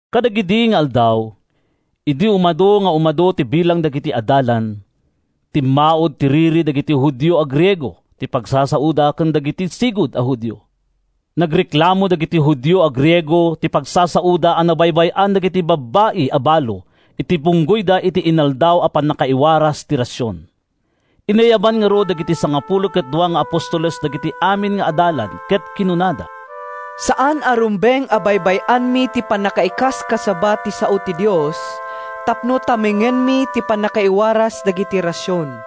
Kadagidi nga aldaw, idi umadu nga umadu ti bilang dagiti adalan, timmaud ti riri dagiti Judio a Griego ti pagsasaoda ken dagiti sigud a Judio. Nagreklamo dagiti Judio a Griego ti pagsasaoda a nabaybay-an dagiti babbai a balo iti bunggoyda iti inaldaw a pannakaiwaras ti rasion. Inayaban ngarud dagiti sangapulo ket dua nga apostoles dagiti amin nga adalan ket kinunada, “Saan a rumbeng a baybay-anmi ti pannakaikaskasaba ti sao ti Dios tapno tamingenmi ti pannakaiwaras dagiti rasion.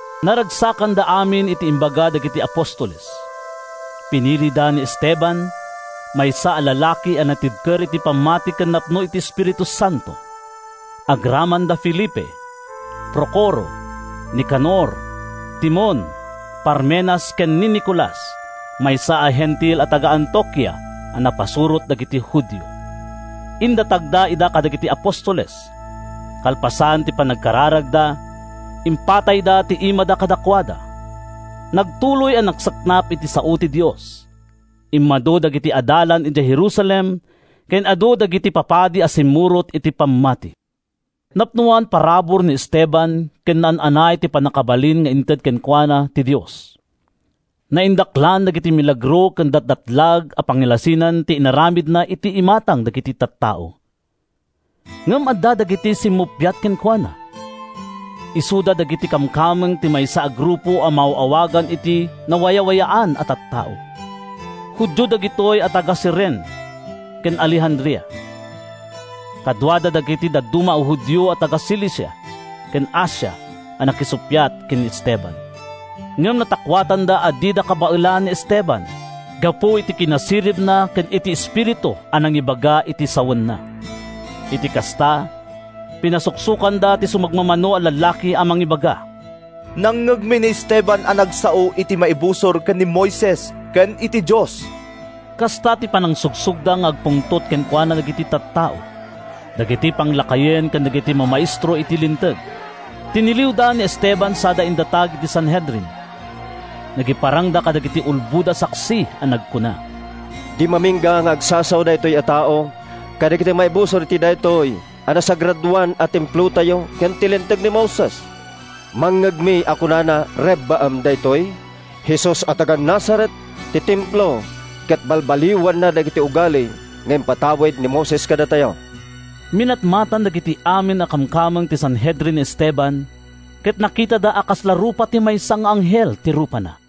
Naragsakanda amin iti imbaga dagiti apostoles. Pinilida ni Esteban, maysa a lalaki a natibker iti pammati ken napno iti Espiritu Santo, agraman da Felipe, Procoro, Nicanor, Timon, Parmenas ken ni Nicolas, maysa a Hentil a taga-Antiokia a napasurot dagiti Judio. Indatagda ida kadagiti apostoles. Kalpasan ti panagkararagda, impatayda ti imada kadakuada. Nagtuloy a nagsaknap ti sao ti Dios. Immadu dagiti adalan idiay Jerusalem ken adu dagi-ti papadi a simmurot iti pam-mati. Napnoan parabur ni Esteban ken naan-anay ti pannakabalin nga inted kenkuana ti Dios. Naindaklan dagiti milagro ken datdatlag a pagilasinan ti inaramidna iti imatang dagiti tattao. Ngem adda dagiti simmupiat kenkuana. Isuda dagiti kamkameng ti maysa a grupo a maaw-awagan iti “Nawayawayaan a Tattao.” Judio dagitoy a taga-Cirene ken Alejandria. Kaduada dagiti dadduma a Judio a taga-Cilicia ken Asia a nakisuppiat ken ni Esteban. Ngem natakuatanda a dida kabaelan ni Esteban gapu iti kinasiribna ken iti Espiritu a nangibaga iti sawenna. Iti kasta, pinasuksokanda ti sumagmamano a lallaki a mangibaga, “Nangngegmi ni Esteban a nagsao iti maibusor ken ni Moises ken iti Dios.” Kasta ti panangsugsogda nga agpungtot kenkuana dagiti tattao, dagiti panglakayen ken dagiti mamaestro iti Linteg. Tiniliwda ni Esteban sada indatag iti Sanhedrin. Nagiparangda kadagiti ulbod a saksi a nagkuna, “Di mamingga nga agsasao daytoy a tao kadagiti maibusor iti daytoy nasagradoan a Templotayo ken iti Linteg ni Moises. Nangngegmi a kunana a rebbaen daytoy Jesus a taga-Nazaret ti Templo ket balbaliwanna dagiti ugali nga impatawid ni Moises kadatayo!” Minatmatan dagiti amin a kamkameng ti Sanhedrin ni Esteban ket nakitada a kasla rupa ti maysa nga anghel ti rupana.